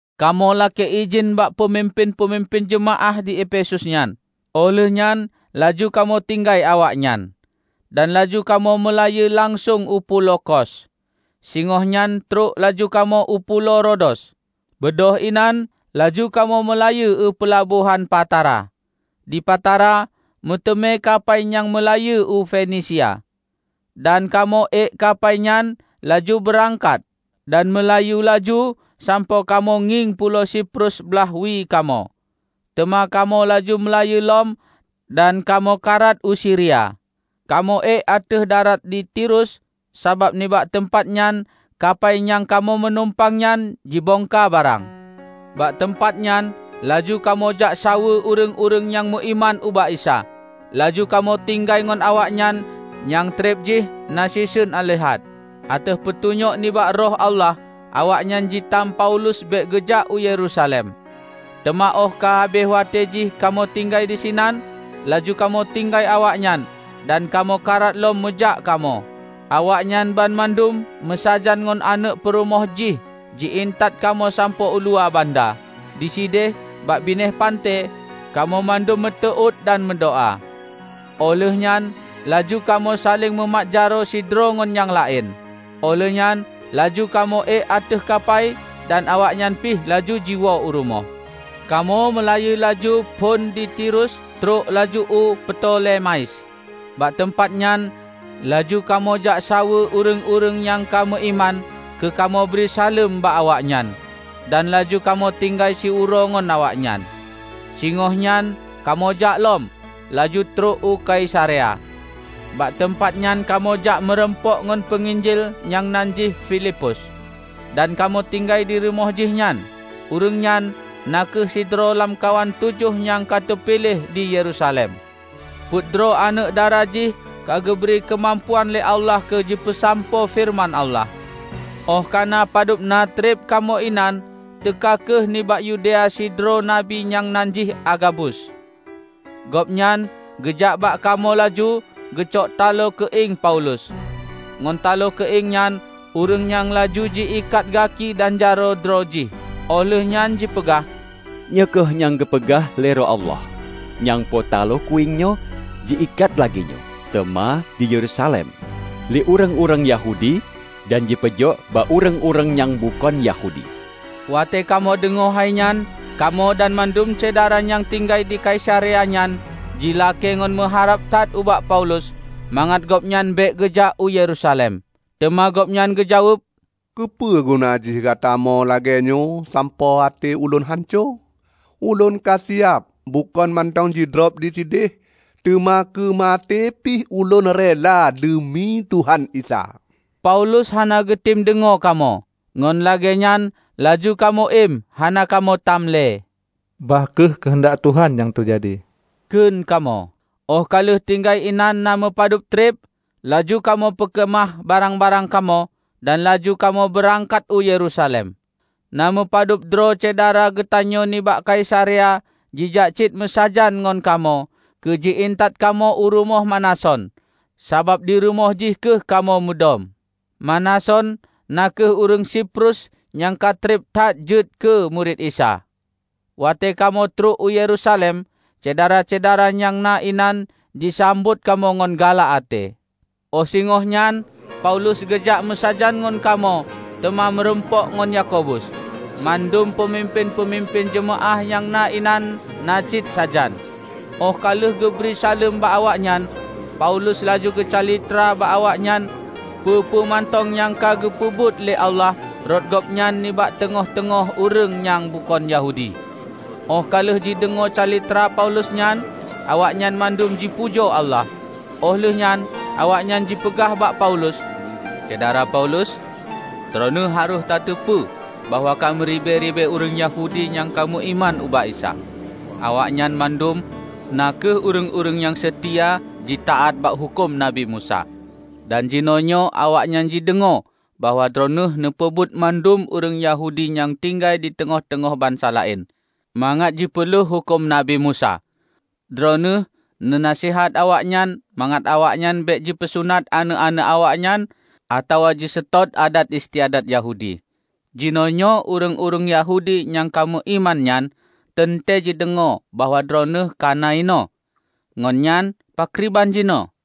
Kamoe lakée idhin bak peumimpén-peumimpén jeumaáh di Efesus nyan, óh lheueh nyan laju kamoe tinggai awaknyan. Dan laju kamoe meulayeue langsong u pulo Kos; singohnyan trok laju kamoe u pulo Rodos. Beudôh inan laju kamoe meulayeue u peulabohan Patara. Di Patara, meuteumé kapai nyang meulayeue u Fenisia. Dan kamoe ék kampai nyan laju beurangkat dan meulayeue laju sampoe kamoe ngieng pulo Siprus blaih wie kamoe; teuma kamoe laju meulayeue lom dan kamoe karat u Siria. Kamoe ék ateueh darat di Tirus, sabab nibak teumpatnyan kapai nyang kamoe meunumpang nyan jibongka barang. Bak teumpatnyan laju kamoe jak saweue ureuëng-ureuëng nyang meuiman ubak Isa, laju kamoe tinggai ngon awaknyan nyang treb jih na siseun aleuhat. Ateueh peutunyok nibak Roh Allah awaknyan jitam Paulus bék geujak u Yerusalem. Teuma óh ka habéh watée jih kamoe tinggai disinan, laju kamoe tinggai awaknyan dan kamoe karat lom meujak kamoe. Awaknyan banmandum meusajan ngon aneuëk peurumoh jih ji-intat kamoe sampoe uluwa banda. Disideh bak binéh panté, kamoe mandum meuteuôt dan meudoá. Óh lheuehnyan laju kamoe saléng mumat jaroe sidroe ngon nyang laén, óh lheueh nyan laju kamoe ék ateueh kapai dan awaknyan pih laju jiwoe u rumoh. Kamoe meulayeue laju phon di Tirus trok laju u Ptolemais. Bak teumpat nyan laju kamoe jak saweue ureuëng-ureuëng nyang ka, meuiman keu kamoe bri saleuem bak awaknyan, dan laju kamoe tinggai siuroe ngon awaknyan. Singohnyan kamoe jak lom, laju trok u Kaisarea. Bak teumpat nyan kamoe jak meurumpok ngon peunginjil nyang nan jih Filipus, dan kamoe tinggai dirumoh jihnyan. Ureuëng nyan na kheueh sidroe lamkawan tujoh nyang ka teupiléh di Yerusalem. Peuet droe aneuëk dara jih ka geubri keumampuan lé Allah keu jipeusampoe feureuman Allah. Óh kana padubna treb kamoe inan, teuka kheueh nibak Yudea sidroe nabi nyang nan jih Agabus. Gobnyan geujak bak kamoe laju geucok talo keuieng Paulus. Ngon talo keuieng nyan ureuëng nyang laju ji ikat gaki dan jaroe droe jih. Óh lheueh nyan jipeugah, "Nyoe kheueh nyang geupeugah lé Roh Allah: Nyangpo talo keuieng nyoe jiikat lagéenyoe teuma di Yerusalem lé ureuëng-ureuëng Yahudi, dan jipeujok bak ureuëng-ureuëng nyang bukon Yahudi." Watée kamoe deungoe hainyan, kamoe dan mandum syedara nyang tinggai di Kaisarea nyan jilakée ngon meuharab that ubak Paulus mangat gobnyan bék geujak u Yerusalem. Teuma gobnyan geujaweueb, "Keupeuguna jih gatamo lagée nyoe sampoe até ulôn hanco? Ulôn ka siab bukon mantong jidrob disideh, teuma keu maté pih ulôn rela deumi Tuhan Isa." Paulus hana geutem deungoe kamoe, ngon lagée nyan laju kamoe iem hana kamoe tam le. "Bah kheueh keuheundak Tuhan nyang teujadi," kheun kamoe. Óh ka lheueh tinggai inan na meupadub treb, laju kamoe peukeumah barang-barang kamoe, dan laju kamoe beurangkat u Yerusalem. Na meupadubdroe syedara geutanyoe nibak Kaisarea jijak cit meusajan ngon kamoe keu ji-intat kamoe u rumoh Manason, sabab dirumoh jih kheueh kamoe mudom. (Manason na kheueh ureuëng Siprus nyang ka treb that jeuet keu murit Isa). Watée kamoe trok u Yerusalem, syedara-syedara nyang na inan jisambot kamoe ngon galak até. Óh singohnyan Paulus geujak meusajan ngon kamoe teuma meurumpok ngon Yakobus; mandum peumimpén-peumimpén jeumaáh nyang na inan na cit sajan. Óh ka lheueh geubri saleuem bak awaknyan, Paulus laju geucalitra bak awaknyan peue-peue mantong nyang ka geupeubuet lé Allah rot gobnyan nibak teungoh teungoh ureuëng nyang bukon Yahudi. Óh ka lheueh jideungoe calitra Paulus nyan, awaknyan mandum jipujoe Allah. Óh lheueh nyan awaknyan jipeugah bak Paulus, "Syedara Paulus! Droeneueh harôh tateupeue bahwa ka meuribée-ribée ureuëng Yahudi nyang ka meuiman ubak Isa. Awaknyan mandum na kheueh ureuëng-ureuëng nyang seutia jitaát bak huköm Nabi Musa. Dan jinoenyoe awaknyan jideungoe bahwa Droeneueh neupeubeuet mandum ureuëng Yahudi nyang tinggai diteungoh-teungoh bansa laén, mangat jipeuleueh huköm Nabi Musa. Droeneueh neu naseuhat awaknyan mangat awaknyan bék jipeusunat aneuëk-aneuëk awaknyan atawa jiseutôt adat istiadat Yahudi. Jinoenyoe ureuëng-ureuëng Yahudi nyang ka meuiman nyan teuntée jideungoe bahwa Droeneueh kana inoe. Ngon nyan, pakriban jinoe?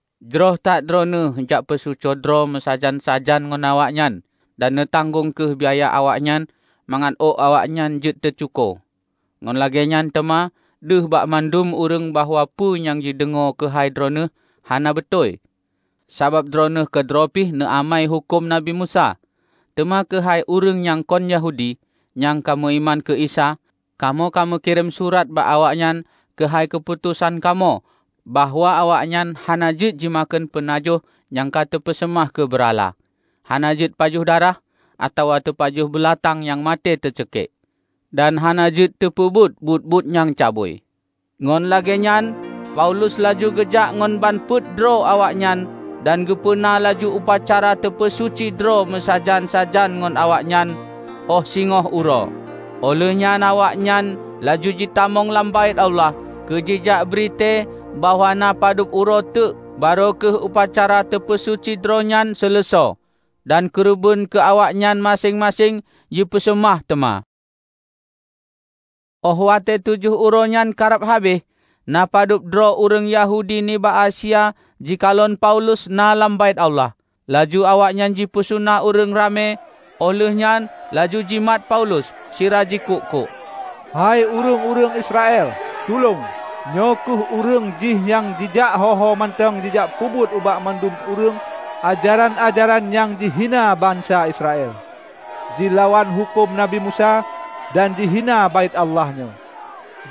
Jroh that Droeneueh jak peusuci droe meusajan-sajan ngon awaknyan, dan neutanggong kheueh biaya awaknyan mangat ôk awaknyan jeuet teucuko. Ngon lagée nyan teuma deuh bak mandum ureuëng bahwa peue nyang jideungoe keuhai Droeneueh hana beutôi, sabab Droeneueh keudroe pih neuamai huköm Nabi Musa. Teuma keuhai ureuëng nyang kon Yahudi nyang ka meuiman keu Isa, kamoe ka meukirém surat bak awaknyan keuhai keuputosan kamoe bahwa awaknyan hana jeuet jimakheun peunajoh nyang ka teupeuseumah keu beurala, hana jeuet pajoh darah, atawa teupajoh beulatang nyang maté teuceukiek; dan hana jeuet teupeubuet buet-buet nyang cabui." Ngon lagée nyan Paulus laju geujak ngon ban peuet droe awaknyan dan geupeuna laju upacara teupeusuci droe meusajan-sajan ngon awaknyan óh singoh uroe. Óh lheueh nyan awaknyan laju jitamong lam Baét Allah keu jijak bri tée bahwa na padub uroe teuk barô kheueh upacara teupeusuci droe nyan seuleusoe dan keureubeuen keu awaknyan maséng-maséng jipeuseumah teuma. Óh watée tujoh uroenyan karab habéh, na padub droe ureuëng Yahudi nibak Asia jikalon Paulus na lam Baét Allah. Laju awaknyan jipeusuna ureuëng ramé, óh lheuehnyan laju jimat Paulus sira jikuk-kuk, "Hai ureuëng-ureuëng Israel, tulông! Nyoe kheueh ureuëng jih nyang jijak ho-ho mantong jijak peubeuet ubak mandum ureuëng ajaran-ajaran nyang jihina bansa Israel, jilawan huköm Nabi Musa dan jihina Baét Allah nyoe.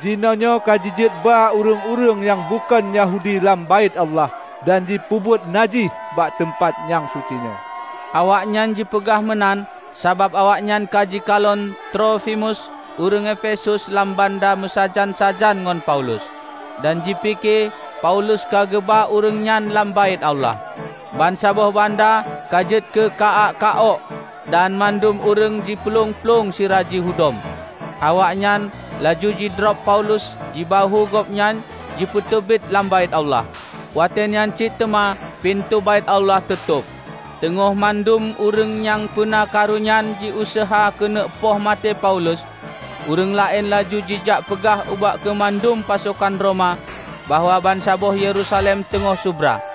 Jinoenyoe ka jijeuet ba ureuëng-ureuëng nyang bukon Yahudi lam Baét Allah dan jipeubuet najih bak teumpat nyang sucinyoe!" ( Awaknyan jipeugah meunan sabab awaknyan ka jikalon Trofimus ureuëng Efesus lam banda meusajan-sajan ngon Paulus; dan jipike Paulus ka geuba ureuëng nyan lam Baét Allah.) Bansaboh banda ka jeuet keu ka-ak ka-ôk, dan mandum ureuëng jiplueng-plueng sira jihudom. Awaknyan laju jidrob Paulus jibahue gobnyan jipeuteubiet lam Baét Allah. Watée nyan cit teuma pintoe Baét Allah teutôb. Teungoh mandum ureuëng nyang peuna karu nyan jiuseuha keuneuk poh maté Paulus, ureuëng laén laju jijak peugah ubak keumandan pasokan Roma bahwa bansaboh Yerusalem teungoh subra.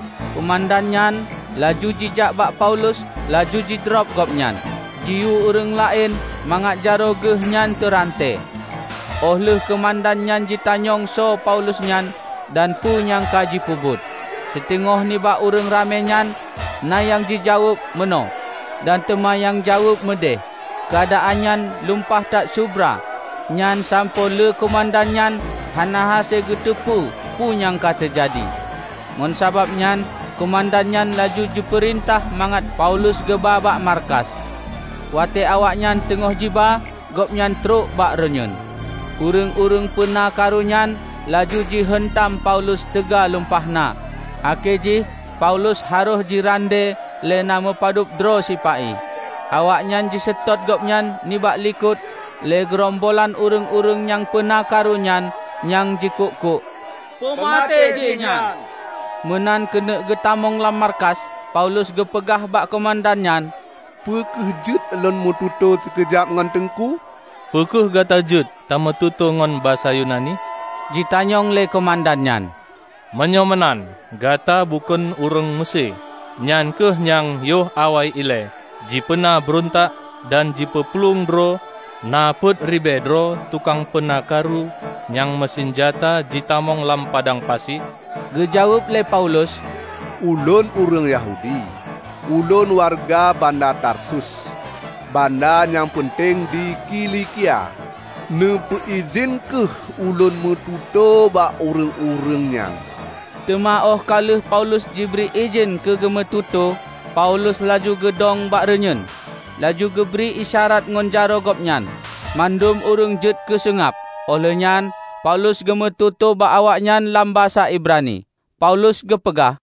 Keumandan nyan laju jijak bak Paulus laju jidrob gobnyan, jiyue ureuëng laén mangat jaroe geuh nyan teuranté. Óh lheueh keumandan nyan jitanyong soe Paulus nyan dan peue nyang ka jipeubuet. Siteungoh nibak ureuëng ramé nyan na nyang jaweueb meunoe dan teuma nyang jaweueb meudeh. Keuadaan nyan lumpah that subra nyan sampoe lé keumandan nyan hana hase geuteupeu peue nyang ka teujadi. Ngon sabab nyan keumandan nyan laju jipeurintah mangat Paulus geuba bak markas. Watée awaknyan teungoh jiba gobnyan trok bak reunyeuen. Ureuëng-ureuëng peuna karu nyan laju ji heuntam Paulus teuga lumpah na akhé jih Paulus harôh jirandée lé na meupadub droe sipa-i. Awaknyan jiseutôt gobnyan nibak likot lé geurombolan ureuëng-ureuëng nyang peuna karu nyan nyang jikuk-kuk, "Peumaté jihnyan!" Meunan keuneuk geutamong lam markas, Paulus geupeugah bak keumandan nyan, "Peu kheueh jeuet lôn meututoe sikeujab ngon Teungku?" "Peu kheueh gata jeuet tameututoe ngon basa Yunani?" Jitanyong lé keumandan nyan. "Meunyoe meunan, gata bukon ureuëng Meusé, nyan kheueh nyang yoh awai ilée jipeuna beurontak dan jipeuplueng droe na peuet ribée droe tukang peuna karu nyang meusinjata jitamong lam padang pasi?" Geujaweueb lé Paulus, "Ulôn ureuëng Yahudi; ulôn wareuga banda Tarsus, banda nyang peunteng di Kilikia. Neupeuidhin kheueh ulôn meututoe bak ureuëng-ureuëng nyan." Teuma óh ka lheueh Paulus jibri idhin keu geumeututoe, Paulus laju geudong bak reunyeuen, laju geubri isyarat ngon jaroe gobnyan. Mandum ureuëng jeuet keuseungab. Óh lheueh nyan Paulus geumeututoe bak awaknyan lam basa Ibrani. Paulus geupeugah.